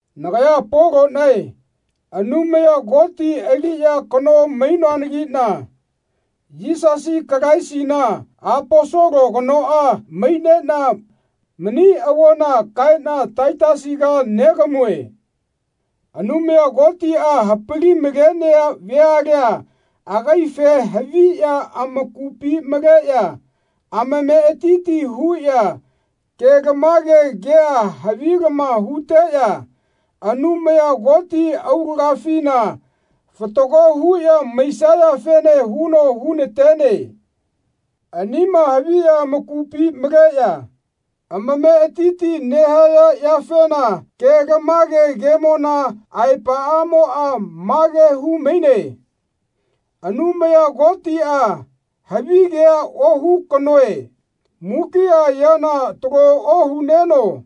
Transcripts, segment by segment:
Nagaya Polonae Anumaya Koti aliya kano mainoanagina Yisasi Kalaisina Aposolo kanoa mainena mani avona kaena Taitasiga negamue. Anumaya Kotia hapali-malenea veala agaife haviya amakupi maleya amametiti huya kelamage kea havilama huteya Anumaya Koti aulagafina fatago huya maisayafene huno hunatene. Anima haviya amakupi maleya amametiti nehaya yafena kelamage kemona aepaamoa mage humaine Anumaya Kotia, havigea ohu kanoe, mukia yana talo ohuneno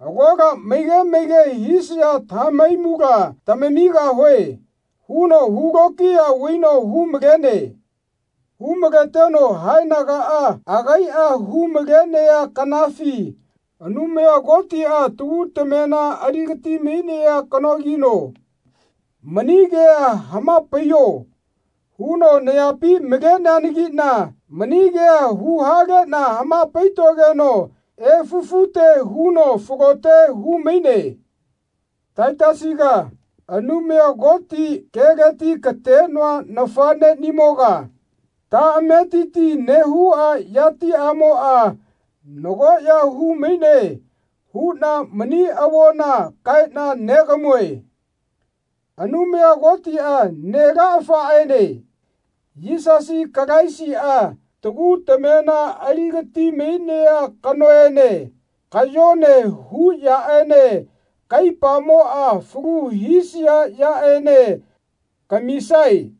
Agola maige maige hisaya tamahaimula lamamigahue. huno hu lokiya vaino hu-malene. Hu-maleteno haenagaa agaia hu-malenea kanafi Anumaya Kotia, tagu tamena aligati-mainea kanogino, Mani kea hamapaiyo. huno nayapi maleneanagina mani kea huhalena hamapaitogeno efufute huno falote humaine. Taitasiga, Anumaya Koti keleti katenoa nafanenimoga, taametiti nehua yatiamoa nagoya humaine huna mani avona kaena negamue. Anumaya Kotia Nelaafaene Yisasi Kalaisia, tagu tamema aligati-mainea kanoene, kayone hu yaene kaipamoa falu hisia yaene kamisae.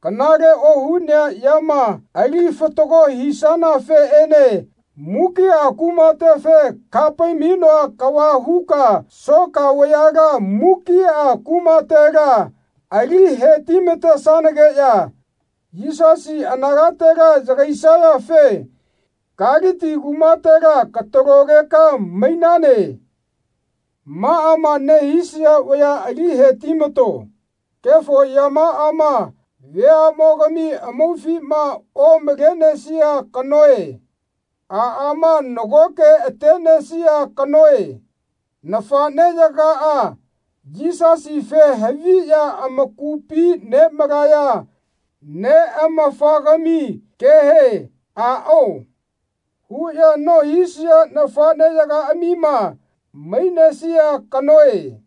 Kanale ohunea yama ali fatago hisanafeene mukia kumatefe kahapai-mainoa kava huka soka vayala mukia kumatela ali heti-matesanageya Yisasi anagatela yagaisayafe Kaliti kumatela katalogeka mainane. Maama nehisaya vaya ali heti-mato. Kefo yamaama veamogami amaufima omalenesia kanoe. Aama nagoke atenesia kanoe. Nafaneyagaa Yisasife haviya amakupi nemaleya neamafagami kehe Aao. huya nohisaya nafaneyagaamima mainesia kanoe.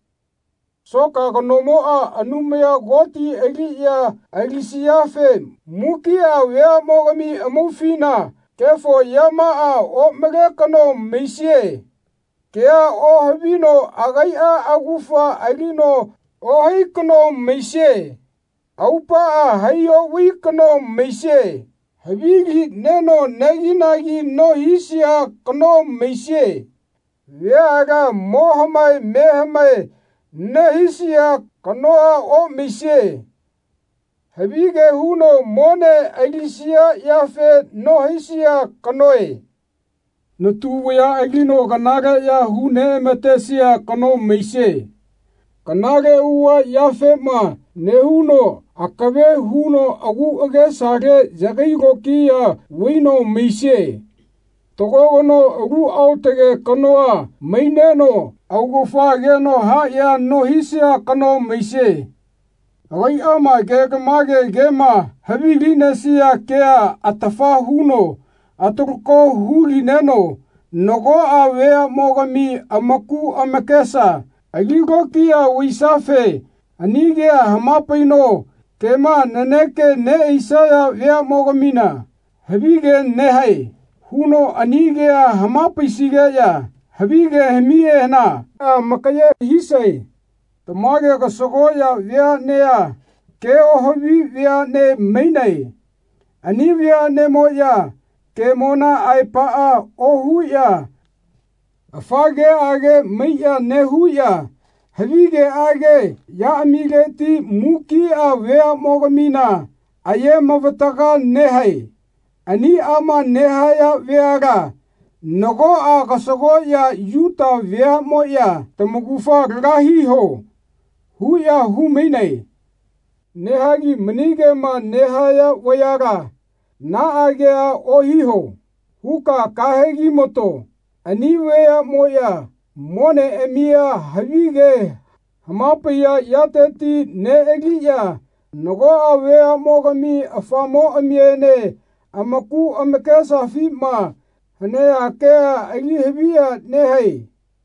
Soka kanomoa Anumaya Koti aliya alisiafe mukia veamogami amaufina kefo yamaa omale kano maisie. Kea ohavino agaia augafa alino ohai kano maisie. Aupaa hai ovai kano maisie. Havili neno aneginagi nohisia kano maisie. Veala mo hamae me hamae nehisia kanoa omaisie. Havige huno mone alisia yafema nohaisia kanoe. Natu vaya alino kanaleya hu neamatesia kano maisie. Kanale auava yafema nehauno akave huno agu agesale yagai lokiya vaino maisie. Fatago kano alu aotage kanoa maineno augafa ageno hayea nohisia kano maisie. Agaiama kelamage kema havilinesia kea atafa huno atalako hulineno nagoa veamogami amaku amakesa ali lokiya vaisiafe ani kea hamapaino kema naneka neaisaya veamogamina Havige nehae. huno ani kea hamapaisigeya havigeamihena amakaye hisae. Tamage kasagoya veanea ke ohavi veane mainae. Ani veanemoya kemona aepaa ohuya afa keage maiya nehuya havigeage yaamileti mukia veamogamina aye-mavataga nehae. Aniama nehaya veala nagoa kasagoya Yuta vayamoya Tamaugafa laga hiho. huya humainae. Nehagi mani kema nehaya vayala Naa kea ohiho. huka kahegi-mato. Ani vayamoya moneamia havige hamapaiya yateti nealiya nagoa veamogami afamoamiene amaku amakesafima hanea kea ali haviya nehae.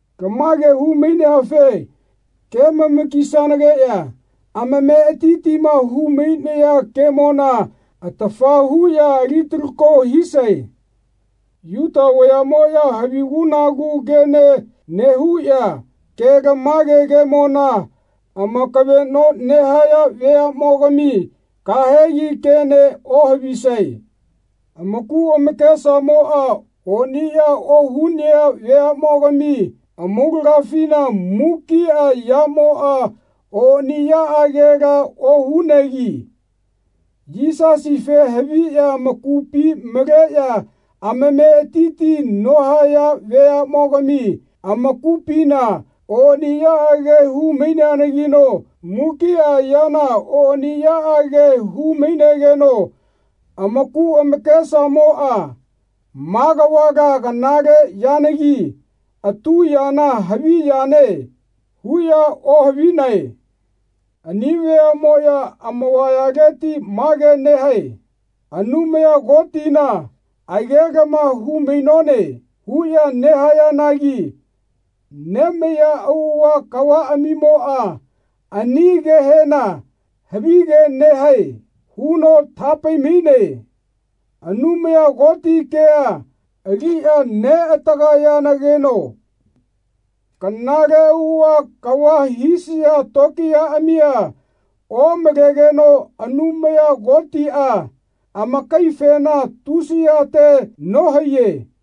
Lamage hu-maineafe kemama-kisanageya amametiti humainaya kemona atafa huya ali-talako hisae. Yuta vayamoya havigu-nagu kene nehuya kelamage kemona amakaveno nehaya veamogami kahegi kene ohavisae. Amaku amakesamoa oniya ohunea veamogami amaulagafina mukia yamoa oniyaagela ohunegi Yisasife haviya amakupi maleya amametiti nohaya veamogami amakupina oniyaage hu-maineanagino mukia yana oniyaage hu-mainegeno amaku amakesamoa Ma kavala kanale yanagi atu yana havi yane. huya ohavinae. Ani veamoya amavayaleti mage nehae Anumaya Kotina agelama hu-mainone. huya nehayanagi nemaiya auava kavaamimoa ani kehena Havige nehae. huno tahapai-maine. Anumaya Koti kea aliya neatagayageno kanale auava kava hisaya tokiyaamia omalegeno Anumaya Kotia amakaifena tusiyate nohaiye.